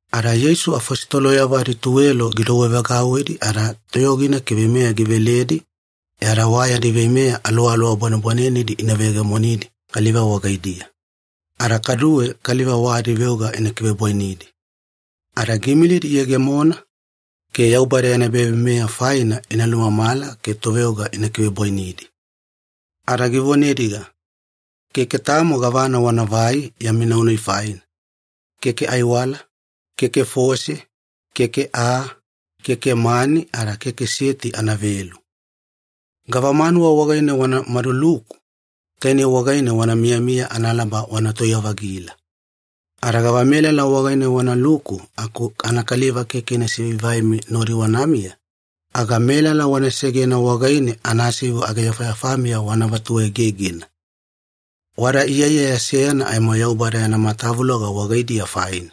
Ada Yeisu afositoloyavo adituwelo gidouwevagauwidi ada toyogina ke veimeya giveledi e ada wa yadi veimeya aluwaluwa bwanebwanenedi ina veyegemonidi kaliva wagaidiya, ada kaduwe kaliva wa adiveoga ina kivebwainidi. Ada giimilidi iyegemona ke Yaubada yana ebaveimeya faina ina lumamala ke toveoga ina kivebwainidi. Ada givonediga, “Keke tamo gavana wanavai yami nau-nai faina, keke aiwala, keke fose, keke aa, keke mani, ada keke seti anavelu. Gavamanuwa wagaine wana maduluku, tainei wagaine wana miyamiya analaba wana tauya-vagila. Ada gavamelala wagaine wanaluku aku anakaliva keke ina sivaivaimi nodi wanamiya, aga melala wana segena wagaine anasivu ageyafayafamiya wana vatuegegena. Wada iyaiyaya seyana aimo Yaubada yana matavuloga wagaidiya faina.”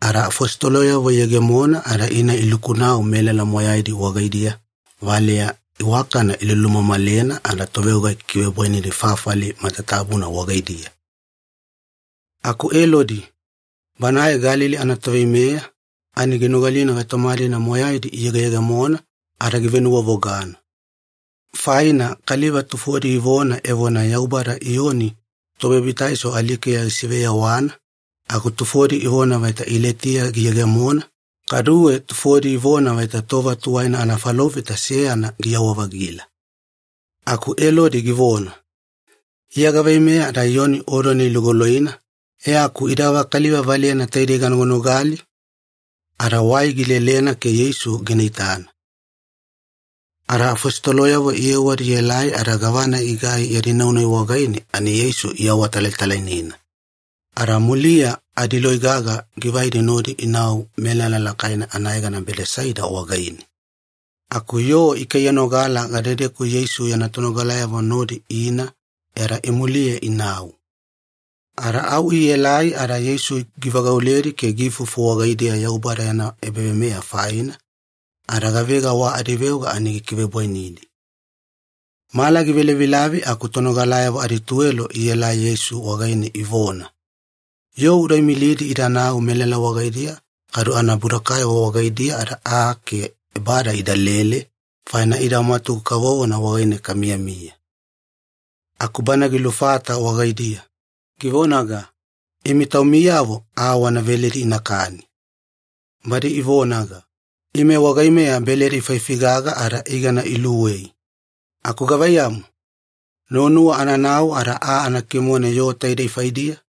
Ada afositoloyavo iyegemona ada ina iluku-nau melala moyaina wagaidiya valeya iwakana ilulumamalena ada toveoga ikikivebwainidi fafali matatabuna wagaidiya. Aku Elodi, banae Galili anatoveimeya, ani ginogalina gaitoma-dina moyaidi iyegeyegemona ada givenuwavogana. Faina kaliva tufodi ivona evona Yaubada Iyoni Tobabitaiso alikeya gisiveyawana, aku tufodi ivona vaita Ilaitiya giyegemona, kaduwe tufodi ivona vaita tova tuwaina anafalofita seyana giyawa-vagila. Aku Elodi givona, “Iya gaveimeya ada Iyoni odona ilugoloina, e aku ida gavakaliva valeyana taidei ganoganogali?” Ada wai gilelelena ke Yeisu gina itana. Ada afositoloyavo iyewadi ielai ada gavana igai yadi nau-nai wagaine ani Yeisu iawatalatalainena. Ada muliya adiloi gaga givaidi nodi inau melala lakaina anayegana Bedesaida wagaine. Aku yoo ikaiyanogala gadedeku Yeisu yana tonogalayavo nodi ina e ada imuliye inau. Ada au ielai ada Yeisu givagauledi ke giifufu wagaidiya Yaubada yana ebaveimeya faina, ada gavega wa adiveoga ani gikivebwainidi. Mala givelavilavi aku tonogalayavo adituwelo ielai Yeisu wagaine ivona, “Yoo uda imilidi idanau melala wagaidiya kadu anabudokayavo wagaidiya ada aa ke ebada idalele, faina ida mwatugu kavovona wagaine kamiyamiya.” Aku Bana gilufata wagaidiya, givonaga, “Imi taumiyavo aa wana veledi inakani.” Badi ivonaga, “Ime wagaimeya beledi faifi gaga ada igana iluwei. Aku gavaiyamu, nuwanuwa ananau ada aa ana kimone yoo taidei faidiya?”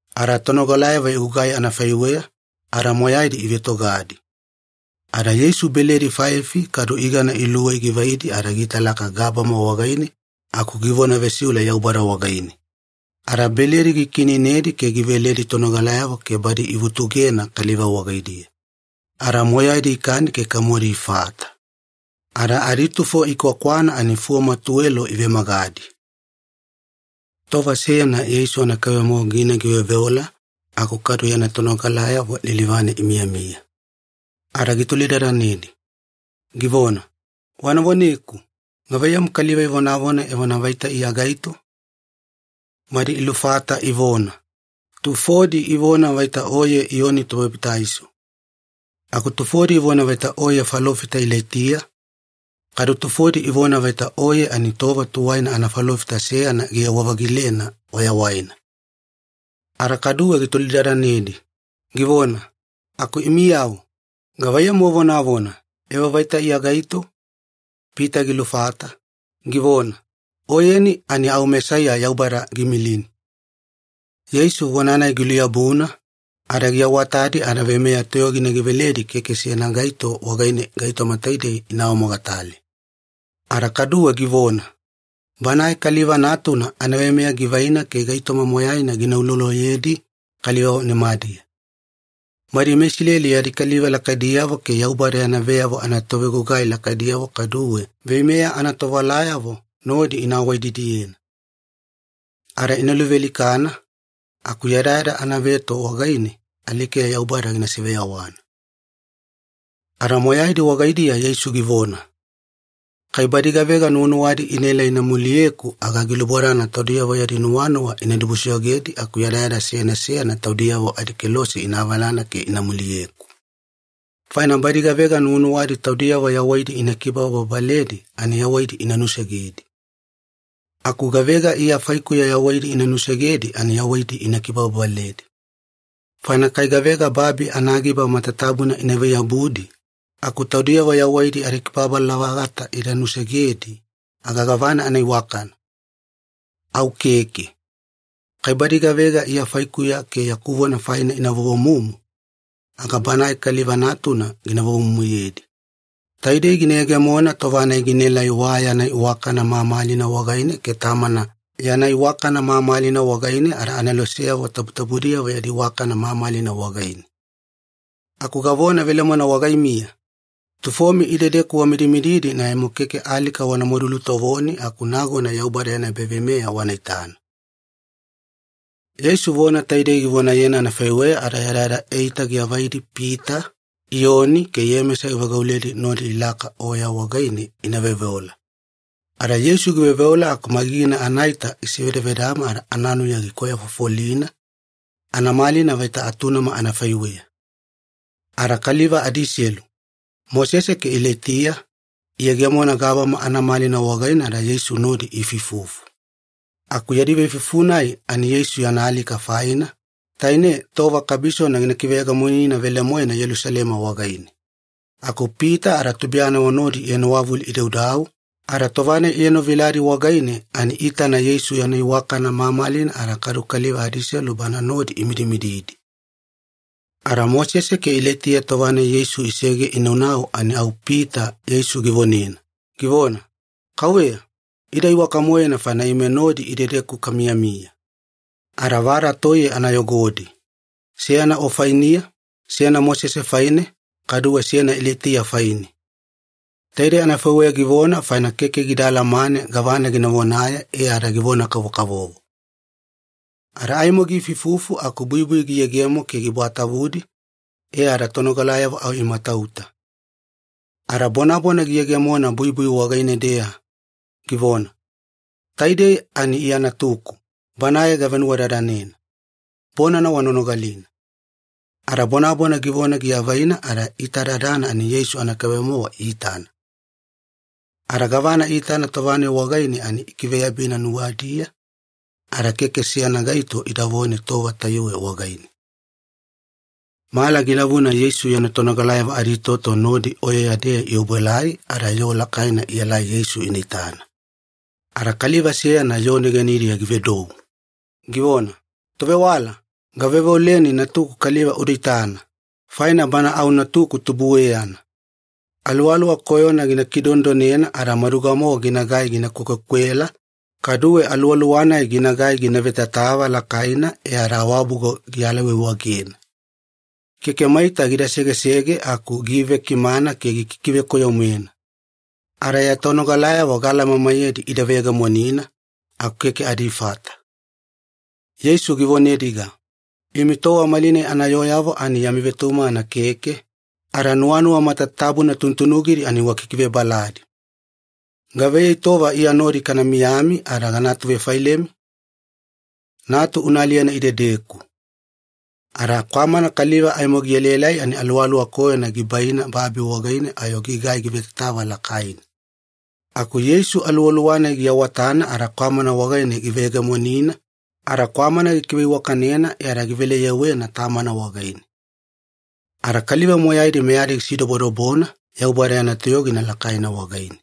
Ada tonogalayavo igugai anafaiweya, ada moyaidi ivetogadi. Ada Yeisu beledi faifi kadu igana iluwei givaidi ada giitalaka gabama wagaine aku givona vesiule Yaubada wagaine, ada beledi gikiineinedi ke giveledi tonogalayavo ke badi ivutugena kaliva wagaidiya. Ada moyaidi ikani ke kamodi ifata. Ada aditufo ikwakwana ani fuwama tuwelo ivemagadi. Tova seyana Yeisu anakaibe-mowa gina giveoveola aku kadu yana tonogalayavo lilivane imiyamiya. Ada gitolidadanedi, givona, “Wana voneku, gavaiyamu kaliva ivonavona evona vaita Iya gaito?” Badi ilufata ivona, “Tufodi ivona vaita Oye Iyoni Tobabitaiso. Aku tufodi ivona vaita Oye falofita Ilaitiya, kaduwe tufodi ivona vaita Oye ani tova tuwaina anafalofita seyana giyewa-vagilena wayawaina.” Ada kaduwe gitolidadanedi, givona, “Aku imiyavo, gavaiyamu wavonavona, evo vaita Iya gaito?” Pita gilufata, givona, “Oyeni ani au Mesaiya Yaubada giimilini.” Yeisu vona-nai giluyabuna, ada giawatadi ada veimeya toyogina giveledi keke seyana gaito wagaine gaitoma taidei ina awamogatale. Ada kaduwe givona, “Banae Kaliva Natuna anaveimeya givaina ke gaitoma moyaina gina uloloyedi kaliva nimadiya. Badi meIsileli yadi kaliva lakaidiyavo ke Yaubada yana veyavo anatovegugai lakaidiyavo kaduwe veimeya anatovewalayavo nodi ina awaididiyena. Ada ina luvealikana, aku yadayada anaveto wagaine alikeya Yaubada gina siveyawana.” Ada moyaidi wagaidiya Yeisu givona, “Kai badi gavega nuwanuwadi inaela ina muliyeku, aga gilubodana taudiyavo yadi nuwanuwa ina dibusoyogedi aku yadayada seyana seyana taudiyavo adikelose ina avalana ke ina muliyeku. Faina badi gavega nuwanuwadi taudiyavo yawaidi ina kibababaledi ani yawaidi ina nusegedi. Aku gavega Iya faikuya yawaidi ina nusegedi ani yawaidi ina kibababaledi. Faina kai gavega babi anagiba matatabuna inavai-yabudi aku taudiyavo yawaidi adikibababala-vagata ida nusegedi, aga gavana anaiwakana? Au keke. Kai badi gavega Iya faikuya ke yaku vona faina ina vovomumu, aga Banae Kaliva Natuna gina vovomumuyedi. Taidei gina yegemona tova-nai ginaelai wa yana iwakana mamalina wagaine ke Tamana yana iwakana mamalina wagaine ada aneloseyavo tabutabudiyavo yadi iwakana mamalina wagaine. Aku gavona velemoena wagaimiya, tufomi idedeku wamidimididi ani aimo keke alika wanamadu lutovoni aku nagona Yaubada yana ebaveimeya wana itana.” Yeisu vona taidei givonayena anafaiweya ada yadayada eita giavaidi Pita, Iyoni, ke Iyemesa givagauledi nodi ilaka oya wagaine ina veoveola. Ada Yeisu giveoveola aku magigina anaita gisevedavedama ada ananuya gikwayafofolina, anamalina vaita atunama anafaiweya. Ada kaliva adiselu, Mosese ke Ilaitiya, iyegemona gabama anamalina wagaine ada Yeisu nodi iifuifufu. Aku yadi veifuifufu-nai ani Yeisu yana alika faina, taine tova kabisona gina kiveyegemonina velemoena Yelusalema wagaine. Aku Pita ada tubuiyanavo nodi ienowavulu idaudau, ada tova-nai ienoviladi wagaine ani iitana Yeisu yana iwakana mamalina ada kaduwe kaliva adiselu Banae nodi imidimididi. Ada Mosese ke Ilaitiya tova-nai Yeisu isege inaunau ani au Pita Yeisu givonena, givona, “Kauveya, ida iwaka-moena faina ime nodi idedeku kamiyamiya. Ada vada toiye ana yogodi, seyana O fainiya, seyana Mosese faine, kaduwe seyana Ilaitiya faine.” Taidei anafaiweya givona faina keke gida alamane gavana gina vonaye e ada givona-kavokavovo. Ada aimo giifuifufu aku buibui giyegemo ke gibwatavudi, e ada tonogalayavo au imatauta. Ada bonabona giyegemona buibui wagaine-deya, givona, “Taidei ani Iya Natuku, Banae gavenuwadadanena. Bonana wana nogalina.” Ada bonabona givona giavaina ada iitadadana ani Yeisu anakaibe-mowa iitana. Ada gavana iitana tova-nai wagaine ani ikiveyabina nuwadiya, ada keke seyana gaito idavone tova tayuwe wagaine. Mala gilavuna Yeisu yana tonogalayavo aditoto nodi oyeya-deya iobuelai ada yoo lakaina ielai Yeisu ina itana. Ada kaliva seyana yoo negenidiya givedou, givona, “Tovewala, gaveoveoleni natuku kaliva uda itana, faina bana au natuku tubueyana. Aluwaluwa koyona gina kidonedonena ada maduga-mowa ginagai gina kwekwekwela, kaduwe aluwaluwa-nai ginagai gina vetatava lakaina e ada awabugo gialaiwaiwagena. Keke maita gida segesege aku giivekimana ke gikikivekoyo-moena. Ada ya tonogalayavo gaalamamaiyedi ida veyegemonina, aku keke adifata.” Yeisu givonediga, “Imi tova malinai anayooyavo ani yami vetumagana keke, ada nuwanuwa matatabuna tunutunugidi ani wakikivebaladi. Gavaiyei tova Iya nodi kana miyami ada gana atuvefailemi? Natu una aliyena idedeku.” Ada kwamana kaliva aimo gielaelai ani aluwaluwa koyona gibaina babi wagaine ayo gigai givetatava lakaina. Aku Yeisu aluwaluwa-nai giawatana ada kwamana wagaine giveyegemonina, ada kwamana gikiveiwakanena e ada givele-yewena tamana wagaine. Ada kaliva moyaidi meyadi gisidobodobona Yaubada yana toyogina lakaina wagaine.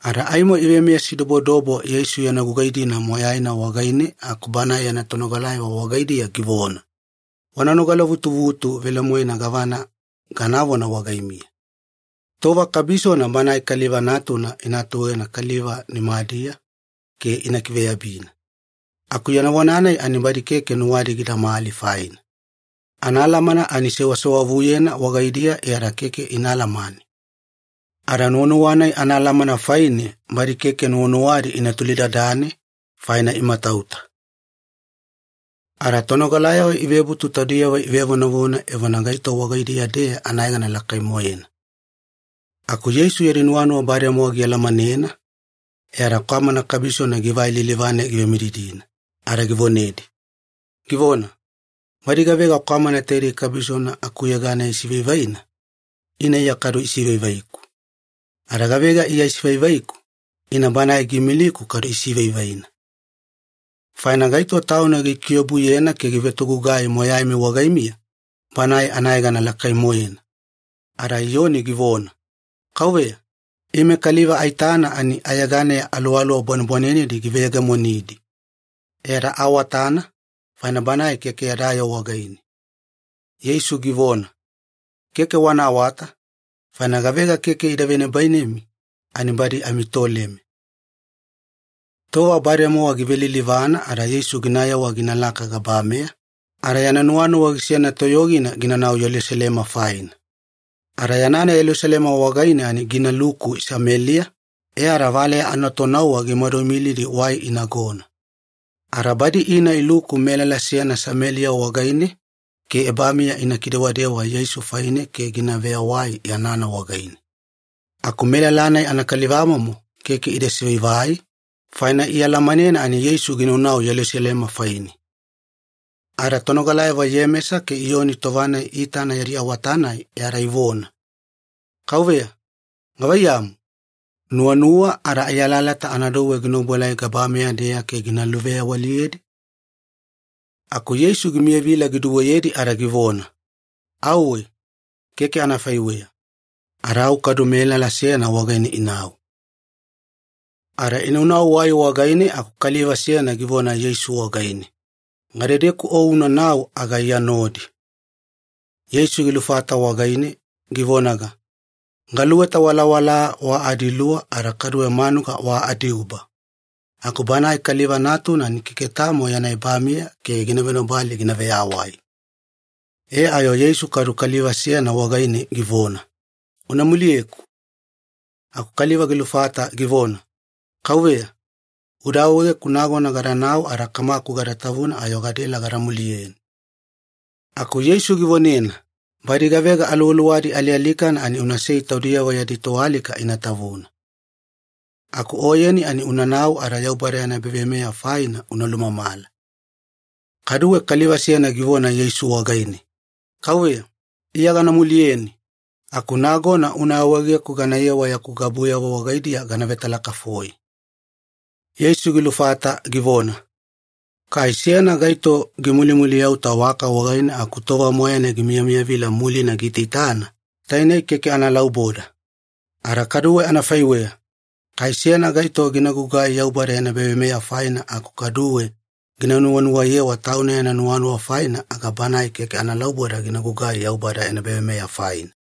Ada aimo ivemeyasidobodobo Yeisu yana gugai-dina moyaina wagaine aku Banae yana tonogalayavo wagaidiya givona, “Wana nogalavutuvutu velemoena gavana ganavona wagaimiya. Tova kabisona Banae Kaliva Natuna ina atuegena kaliva nimadiya ke ina kiveyabina.” Aku yana vona-nai ani badi keke nuwadi gidamali faina. Anaalamana ani sewasewavuyena wagaidiya e ada keke ina alamane. Ada nuwanuwa-nai anaalamana faine badi keke nuwanuwadi ina tolidadane, faina imatauta. Ada tonogalayavo ivebutu taudiyavo ivevonavona evona gaito wagaidiya-deya anayegana lakai-moena. Aku Yeisu yadi nuwanuwa bademowa gialamanena, e ada kwamana kabisona givai lilivane givemididina ada givonedi, givona, “Badi gavega kwamana taidei kabisona akuyeganeya isivaivaina, ina Iya kadu isivaivaiku. Ada gavega Iya isivaivaiku, ina Banae giimiliku kadu isivaivaina. Faina gaito tauna gikiobuyena ke givetogugai moyaimi wagaimiya, banae anayegana lakai-moena.” Ada Iyoni givona, “Kauveya, ime kaliva aitana ani ayeganeya aluwaluwa bwanebwanenedi giveyegemonidi. E ada aawatana, faina banae keke yada yoo wagaine.” Yeisu givona, “Keke wana awata, faina gavega keke ida venibainemi ani badi amitoleme.” Tova bademowa givelilivana ada Yeisu ginayewa ginalaka gabameya, ada yana nuwanuwa gisena toyogina ginanau Yelusalema faina. Ada yanana Yelusalema wagaine ani ginaluku Sameliya, e ada valeya anatonauwa gimadu imilidi wai inagona. Ada badi ina iluku melala seyana Sameliya wagaine ke ebamiya ina kidewadewa Yeisu faine ke gina veyawai yanana wagaine. Aku melala-nai anakalivamomo keke ida sivaivai, faina ialamanena ani Yeisu ginaunau Yelusalema faine. Ada tonogalayavo Iyemesa ke Iyoni tova-nai iitana yadi awata-nai e ada ivona, “Kauveya, gavaiyamu? Nuwanuwa ada ai alalata ana douwe gina obuelai gabameya-deya ke gina luveyawaliyedi?” Aku Yeisu gimiyavila giduweyedi ada givona, “Auwe, keke anafaiweya.” Ada au kadu melala seyana wagaine inau. Ada inaunau wai wagaine aku kaliva seyana givona Yeisu wagaine, “Gadedeku O unanau aga Iya nodi.” Yeisu gilufata wagaine, givonaga, “Galuweta walawala wa adiluwa ada kaduwe manuga wa adiuba, aku Banae Kaliva Natuna ani keke tamo yana ebamiya ke gina venobali gina veyawai.” E ayo Yeisu kadu kaliva seyana wagaine givona, “Una muliyeku.” Aku kaliva gilufata givona, “Kauveya, uda awaegeku nagona gadanau ada kamaku gada tavuna ayo gadaela gada muliyeni.” Aku Yeisu givonena, “Badi gavega aluwaluwadi alialikana ani unasei taudiyavo yadi toalika ina tavuna. Aku oyeni ani unanau ada Yaubada yana ebaveimeya faina una lumamala.” Kaduwe kaliva seyana givona Yeisu wagaine, “Kauveya, Iya gana muliyeni, aku nagona una awaegeku ganayewa yaku gabuyavo wagaidiya gana vetalakafoi.” Yeisu gilufata givona, “Kai seyana gaito gimulimuliyauta waka wagaine aku tova moyaina gimiyamiyavila mulina giitaitana, tainei keke analauboda. Ada kadu anafaiweya, kai seyana gaito gina gugugai Yaubada yana ebaveimeya faina aku kaduwe gina nuwanuwayewa tauna yana nuwanuwa faina, aga banae keke analauboda gina gugai Yaubada yana ebaveimeya faina.”